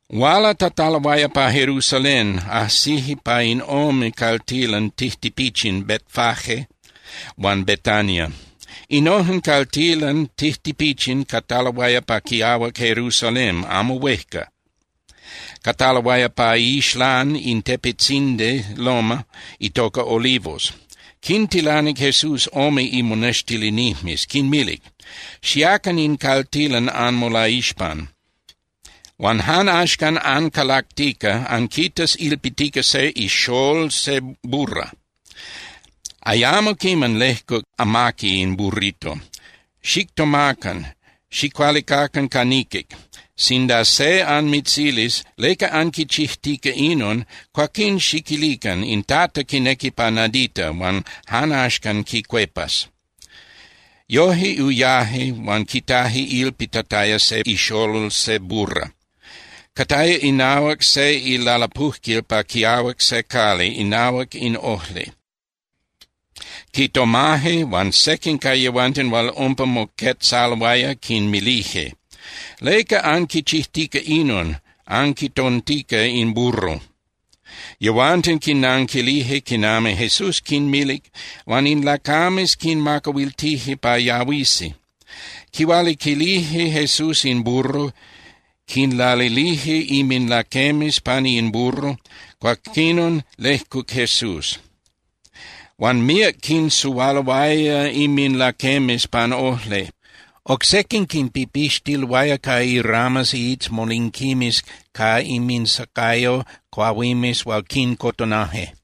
Hualatataloaya pa Jerusalén, ajsije pa in ome caltilan tijtipichin Betfagé huan Betania. Innojen caltilan tijtipichin cataloaya pa quiahuac Jerusalén amo huejca, cataloaya pa iixlán in tepetzindi (loma) itoca Olivos. Quintilanic Jesús ome imonextilinijmes, quinmilic: —Xiacan in caltilan anmolaixpan, huan jan axcan ancalactica, anquitas ilpitica se ixól je burra. Ayamo quiman lejcuc amaqui in burrito. Xictomacan, xicualicacan ca niquic. Sinda se anmitzilis: “¿Leca anquichijtica inon?”, cuaquín xiquilican: “In Tata quinequi pa nadita, huan jan axcan quicuepas.” Yoje uyaje huan quitaje ilpitataya se ixolol se burra. Cataya inahuac se ilalapujquil pa quiahuac se cali inahuac in ojli. Quitomaje, huan sequin ca yehuanten hual umpa moquetzaloaya quinmilije: —¿Leca anquichijtica inon, anquitontica in burro? Yehuanten quinnanquilije quinami Jesús quinmilic, huan in lacames quinmacahuiltije pa yahuisi. Quihualiquilije Jesús in burro, quinlalilije inminlaquemes pani in burro, cuaquinon lejcuc Jesús. Huan míac quinsuhualoaya inminlaquemes pan ojli, oc sequin quinpipixtiloaya ca iramas (iitzmolinquimes) ca inminsacayo cuahuimes hual quincotonaje.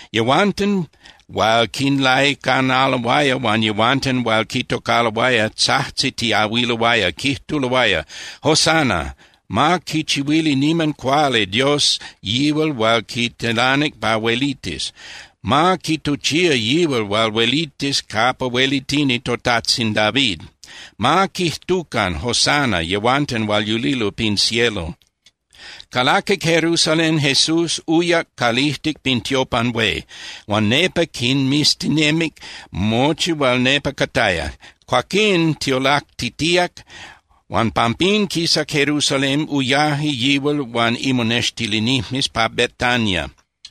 Yehuanten hual quinlaicanaloaya huan yehuanten hual quitocaloaya tzajtzitiahuiloaya, quijtuloaya: —¡Hosana! ¡Ma quichihuili niman cuali Dios yihual hual quitilanic pa huelitis! ¡Ma quituchía yihual hual huelitis capa huelitini totajtzin David! ¡Ma quijtucan “¡Hosana!” yehuanten hual yulilo pin cielo! Calaquic Jerusalén Jesús, uyac calijtic pin tiopan hué, huan nepa quinmiztinemic mochi hual nepa cataya. Cuaquín tiolactitíac, huan pampín quisac Jerusalén, uyaje yihual huan imonextilinijmes pa Betania.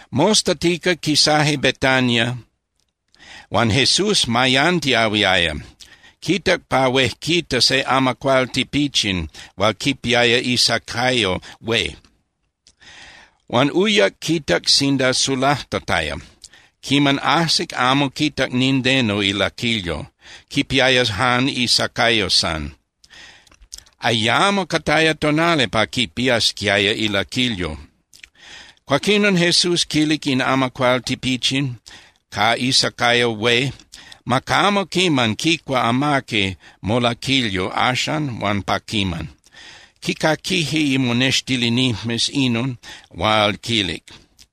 Mostatica quisaje Betania huan Jesús mayantiahuiaya. Quitac pa huejquita se amacuál tipichin hual quipiaya isacayo hué, huan uyac quitac sinda sulajtataya. Quiman ajsic, amo quitac nindeno ilaquilyo. Quipiaya jan isacayo san, ayamo cataya itonali pa quipiasquiaya ilaquilyo. Cuaquinon Jesús quilic in amacuál tipichin ca isacayo hué: —Ma camo quiman quicua amaqui molaquilyo axan huan pa quiman. Quicaquije imonextilinijmes inon hual quilic.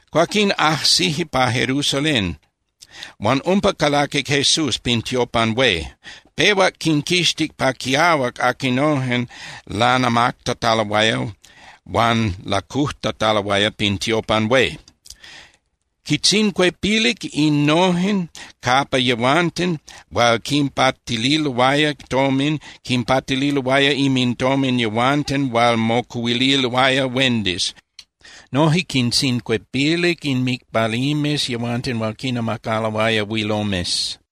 Cuaquín ajsije pa Jerusalén huan umpa calaquic Jesús pin tiopan hué. Pehuac quinquixtic pa quiahuac aquinojen lanamactataloaya huan lacujtataloaya pin tiopan hué. Quintzincuepilic innojen capa yehuanten hual quinpatililoaya tomin quinpatililoaya inmintomin yehuanten hual mocuhuililoaya huendis, noje quintzincuepilic inmicpalijmes yehuanten hual quinnamacaloaya huilomes.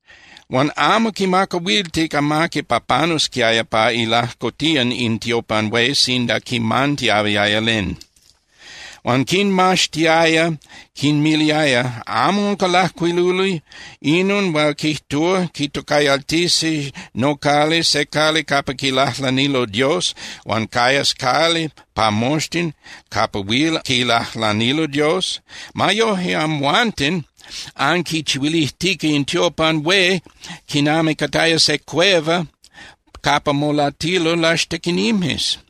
Huan amo quimacahuiltic amaqui pa panusquiaya pa ilajcotían in tiopan hué sinda quimantiahuiaya len. Huan quinmaxtiaya, quinmiliaya: —¿Amo unca lajcuiluli inon hual quijtúa: “Quitocayaltisi nocali se cali capa quilajlanilo Dios, huan cayas cali pa moxtin capa huil quilajlanilo Dios”? Ma yoje, amhuanten anquichihuilijtica in tiopan hué quinami cataya se cueva capa molatilo laxtequinijmes.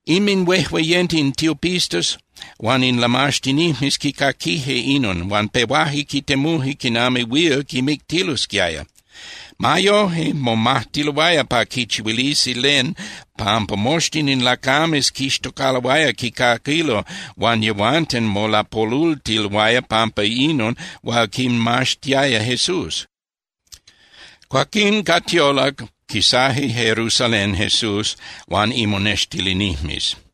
Inminhuejueyenten in tiopistas huan in lamaxtinijmes quicaquije inon, huan pehuaje quitemuje quinami huil quimictilosquiaya. Ma yoje, momajtiloaya pa quichihuilisi len pampa moxtin in lacames quixtocaloaya quicaquilo huan yehuanten molapolultiloaya pampa inon hual quinmaxtiaya Jesús. Cuaquín ca tiolac quisaje Jerusalén Jesús huan imonextilinijmes.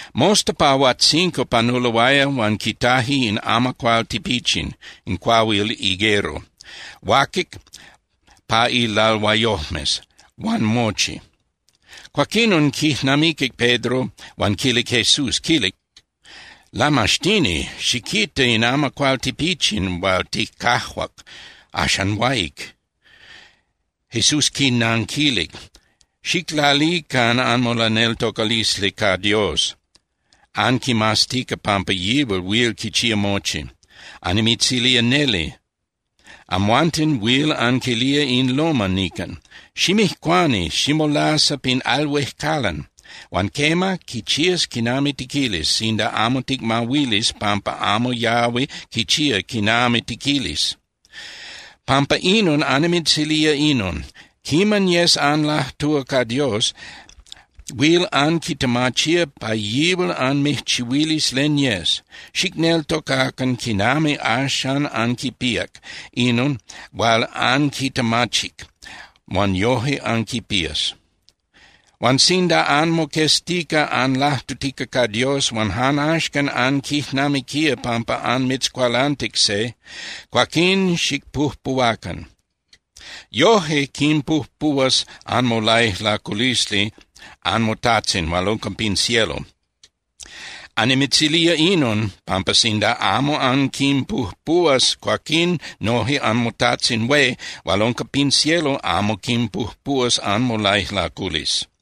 Mosta pa huajtzinco panuloaya huan quitaje in amacuál tipichin (cuahuil higuero), huaquic pa ilalhuayojmes huan mochi. Cuaquinon quijnamiquic Pedro huan quilic Jesús, quilic: —Lamaxtini, xiquita, in amacuál tipichin hual ticajuac, axan huáic. Jesús quinanquilic: —Xiclalican anmolaneltocalisli ca Dios, anquimaztica pampa yihual huil quichía mochi. Annimitzilía neli, amhuanten huil anquilía in loma nican, “Ximijcuani ximolasa pin al huejcalan”, huan quema, quichías quinami tiquilis sinda amo ticmahuilis pampa amo yahui quichía quinami tiquilis. Pampa inon annimitzilía inon: Quiman yes anlajtúa ca Dios, huil anquitemachía pa yihual anmijchihuilis len yes. Xicneltocacan quinami axan anquipíac inon hual anquitemachic, huan yoje anquipías. Huan sinda anmoqueztica anlajtutica ca Dios, huan jan axcan anquijnamiquía pampa anmitzcualantic se, cuaquín xicpujpuhuacan. Yoje quinpujpuhuas anmolaijlaculisli anmoTajtzin hual unca pin cielo. Annimitzilía inon, pampa sinda amo anquinpujpuhuas, cuaquín noje anmoTajtzin hué hual unca pin cielo amo quinpujpuhuas anmolaijlaculisli.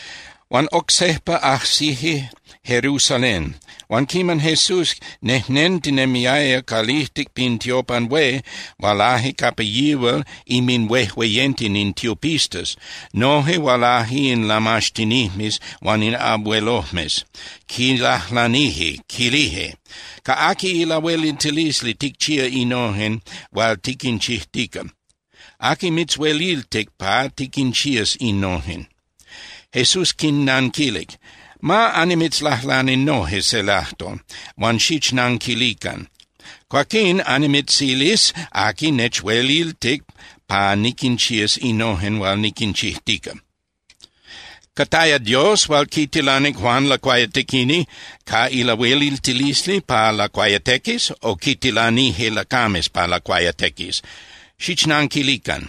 Huan oc sejpa ajsije Jerusalén. Huan quiman Jesús nejnentinemiaya calijtic pin tiopan hué, hualaje capa yihual inminhuejueyenten in tiopistas, noje hualaje in lamaxtinijmes huan in abuelojmes. Quilajlanije, quilije: —¿Ca aqui ilahueliltilisli ticchía innojen hual tiquinchijtica? ¿Aqui mitzhueliltic pa tiquinchías innojen? Jesús quinnanquilic: —Ma annimitzlajlani noje se lajtol, huan xichnanquilican. Cuaquín annimitzilis aqui nechueliltic pa niquinchías innojen hual niquinchijtica. ¿Cataya Dios hual quitilanic Juan Lacuayatequini ca lahueliltilisli pa lacuayatequis o quitilanije lacames pa lacuayatequis? Xichnanquilican.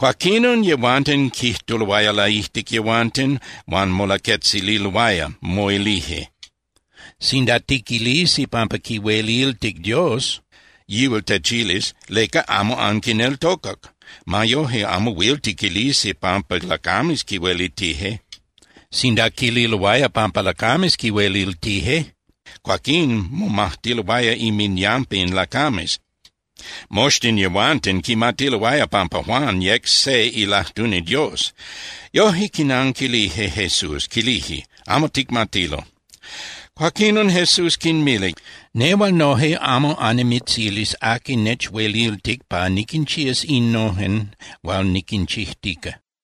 Cuaquinon yehuanten quijtuloaya laijtic yehuanten huan molaquetzililoaya, moilije: —Sinda tiquilisi pampa quihueliltic Dios, yihual techilis: “¿Leca amo anquineltocac?” Ma yoje, amo huil tiquilisi pampa lacames quihueliltije. Sinda quililoaya pampa lacames quihueliltije, cuaquín momajtiloaya inminyampa in lacames. Moxtin yehuanten quimatiloaya pampa Juan yec se ilajtuni Dios. Yoje, quinanquilije Jesús, quilije: —Amo ticmatilo. Cuaquinon Jesús quinmilic: —Nehual noje amo annimitzilis aqui nechueliltic pa niquinchías innojen hual niquinchijtica.